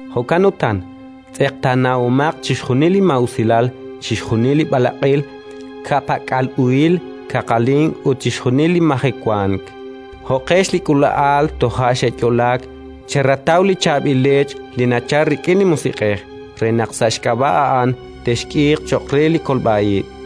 Jo'kan utan, tz'eqtaanahomaq chixjunil li maa'usilal, chixjunil li b'alaq'il, ka'pak'al uhil, kaqalink ut chixjunil li majewank. Jo'qex li k'uula'al toja' xe'yo'laak, cherataw li chaab'il leech li nachalk rik'in li Musiq'ej, re naq sa' xk'ab'a' a'an texk'iiq cho'q re li kolb'a ib':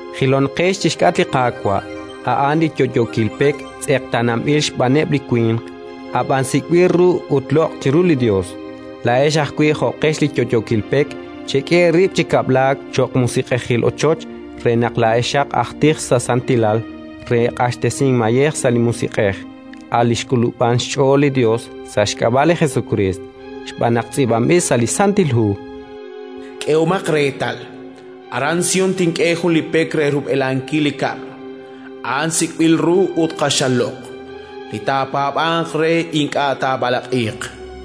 Jilonqex chi xk'atq li Qaawa', a'an li yo'yookil pek tz'eqtaananb'il xb'aaneb' li winq, ab'an sik'b'il ru ut loq' chiru li Yos. Laa'ex ajwi', jo'qex li yo'yookil pek, chek'e eerib' chi kab'laak cho'q musiq'ejil ochoch, re naq laa'exaq aj tij sa' santilal, re q'axtesink mayej sa' li Musiq'ej, a' li naxk'ulub'an xch'ool li Yos sa' xk'ab'a' li Jesukriist. Xb'aan naq tz'iib'anb'il sa' li Santil Hu: “K'ehomaq reetal, aran Sión tink'e jun li pek re rub'elankil li kab'l: a'an sik'b'il ru ut q'axal loq'. Li taapaab'anq re ink'a' taab'alaq'iiq”.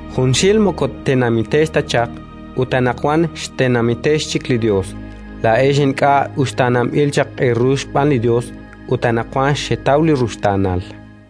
Junxil moko tenamitex ta chaq, ut anaqwan xtenamitex chik li Yos; laa'ex ink'a' uxtaananb'il chaq eeru xb'aan li Yos, ut anaqwan xetaw li ruxtaanal.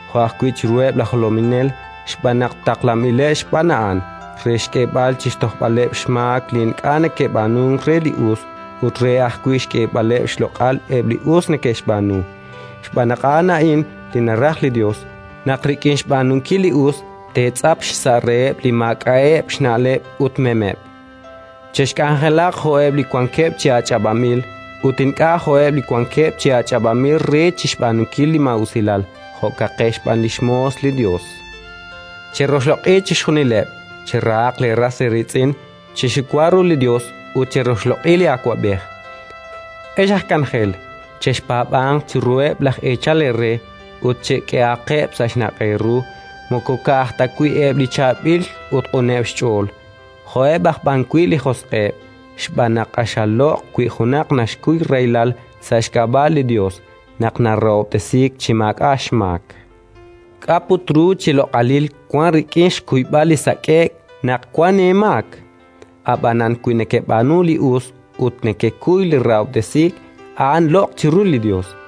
jo' ajwi' chiruheb' laj jolominel, xb'aan naq taqlanb'ileb' xb'aan a'an, re xk'eeb'al chi xtojb'aleb' xmaak li ink'a' neke'b'aanunk re li us, ut re ajwi' xk'eeb'aleb' xloq'al eb' li us neke'xb'aanu. Xb'aan naq a'an a'in li naraj li Yos: naq rik'in xb'aanunkil li us teetz'ap xsa' reheb' li maak'a'eb' xna'leb' ut memeb'. Chexk'anjelaq jo'eb' li wankeb' chi ach'ab'anb'il, ut ink'a' jo'eb' li wankeb' chi ach'ab'anb'il re chik xb'aanunkil li maa'usilal; jo'kaqex b'an li xmoos li Yos. Cheroxloq'i chixjunileb', cherahaq leeras eeriitz'in, chexiwa ru li Yos ut cheroxloq'i li awab'ej. Ex aj k'anjel, chexpaab'anq chiruheb' laj eechal eere ut chek'ehaqeb' sa' xnaq' eeru: moko ka'aj ta wi' eb' li chaab'il ut q'uneb' xch'ool, jo'eb' aj b'an wi' li josq'eb'. Xb'aan naq q'axal loq' wi junaq naxkuy rahilal sa' xk'ab'a' li Yos, naq narahob'tesiik chi maak'a' xmaak. K'a' put ru chi loq'alil wank rik'in xkuyb'al li sak'e'k naq wank eemaak? Ab'anan wi nekeb'aanu li us ut nekekuy li rahob'tesiik, a'an loq' chiru li Yos.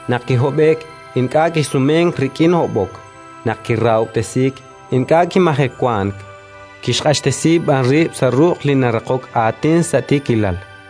Naq kihob'e'k, ink'a' kisumenk rik'in hob'ok; naq kirahob'tesiik, ink'a' kimajewank, kixq'axtesi b'an rib' sa' ruq' Li naraqok aatin sa' tiikilal.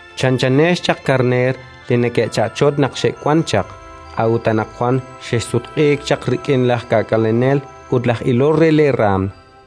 Chanchanex chaq karneer li neke'cha'chotk naq xexwank chaq, a'ut anaqwan xexsutq'iik chaq rik'in laj K'aak'alenel ut laj Ilol re leeraanm.